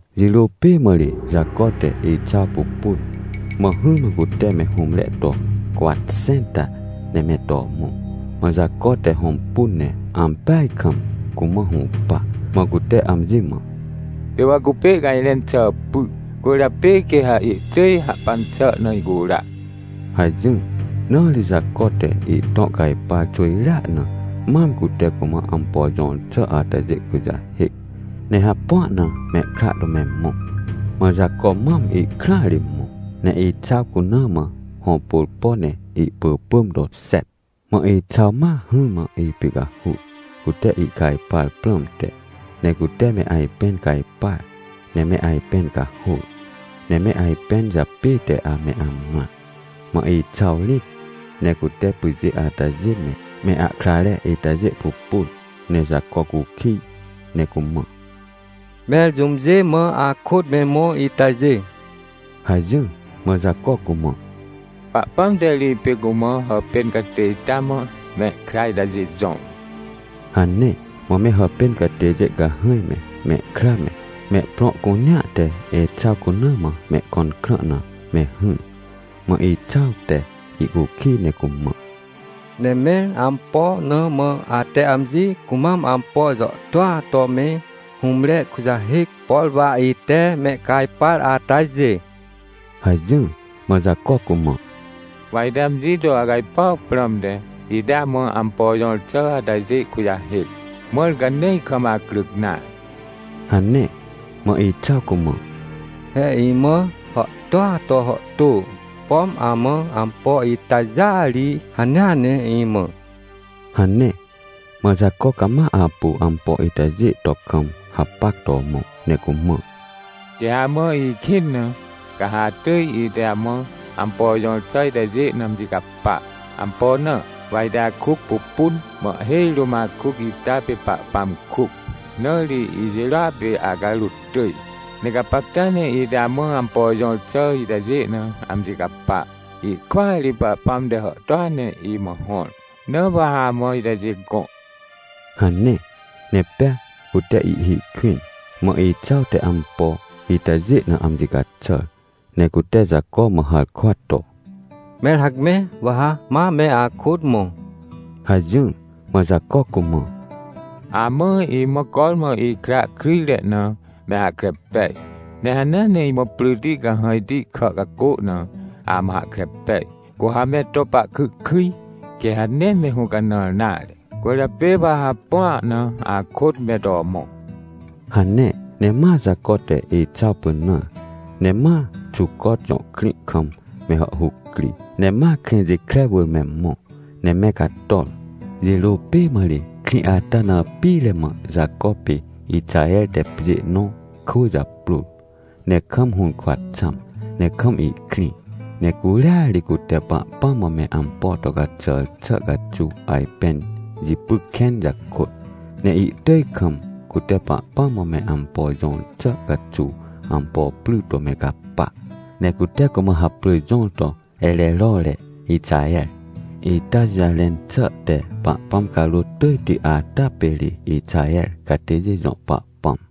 Jirô pê mã ri Jaco te Exaw pupun, mã hỹrmã cute me hũmre to cwatxẽnta ne me to mõ. Mã Jaco te hõmpun ne ampeaj kam cumã hũpa. Mã cute amji mã: — Pê wa cupê ihcajrẽn xà py, cwỳrjapê quê ha ihtỳj hahpan xà na icura — hajỹr. Na ri Jaco te ihtõ cajpar xwỳjrea na mam cute cumã ampo jõr xà atajê kujahêc. Ne hapua na mehkra to me mõ. Mã Jaco mam ihkrãa ri mõ, ne Exaw cuna mã hõpôrpo ne ihpỳpỳm to xet. Mã Exaw ma hỹrmã ipicahur, cute ihcajpar prãmte. Ne cute me ajpẽn cajpar, ne me ajpẽn cahôr, ne me ajpẽn japête ame amrã. Mã Exaw rĩt ne cute pyjê atajê me, me ahkrare itajê pupun, ne Jaco cukij ne cumã: — Mẽr jũmjê mã akôt me mõ itajê? — hajỹr. Mã Jaco cumã: — Pahpãm te ri ipê cumã hàpên catê ita mã mehkra itajê jõr — hane. Mã me hàpên catêjê cahãj me, mehkra me, mehprõ cunea te Exaw cuna mã mehkõn krã na me hỹr. Mã Exaw te ihcukij ne cumã: — Ne mẽr ampo na mã ate amji cumam ampo jàhtôa to me hũmre kujahêc, por wa ite mehcajpar atajê? — hajỹr. Mã Jaco cumã: — Wa ite amji to acajpuaw prãmte, ite amã ampo jõr xà atajê kujahêc, mãr ca nee ikam acryc nare — hane. Mã Exaw cumã: — He imã hàhtôa to hàhtô, pom amã ampo itajêa ri hanea ne imã — hane. Mã Jaco cama apu ampo itajê to kam hapac to mõ ne cumã: — Quê ha amã ikĩn na, ca ha atỳj ite amã ampo jõr xà itajê na amji capa. Ampo na? Wa ite akuc pupun, mã ihhêj rũm akuc ita pê Pahpãm kuc, na ri ijirôa pê acarôt tỳj. Ne gapacta ne ite amã ampo jõr xà itajê na amji capa. Ihkwỳa ri Pahpãm te hàhtôa ne imã hõr, na wa ha amã itajê gõ — hane. Ne pea cute ihhi kwĩn. Mã Exaw te ampo itajê na amji caxàr, ne cute Jaco mã harkwa to: — Mẽr hacme, wa ha ma me akôt mõ — hajỹr. Mã Jaco cumã: — Amã, imã cormã ikra kryjre na, me hahkre pej. Ne hanea ne imã pryti cahãjti kà cacô na, amã hahkre pej. Cu ha me to pahkyhkyj, quê ha nee me hũcanãr nare, cwỳrjapê wa ha hapua na akôt me to mõ — hane. Ne ma Jaco te Exaw pynãr, ne ma Xucot jõ krĩ kam me hàhhuc cri. Ne ma Krĩjikre wỳr me mõ ne me cator. Jirô pê mã ri krĩ ata na pire mã Jaco pê Ixaher te pjê nõ kwỳ japrôr, ne kam hũrkwa xãm ne kam ihkrĩ. Ne curia ri cute Pahpãm mã me ampo to caxàr xà caxuw ajpẽn jipy kẽn jakôt, ne ihtỳj kam, cute Pahpãm mã me ampo jõr xà caxuw ampo pry to me caxàr. Ne cute cumã haprỳ jõr to Ererore Ixaher, ita jũjarẽn xà te “Pahpãm Carôt tỳjti ata pê ri Ixaher catêjê jõ Pahpãm”.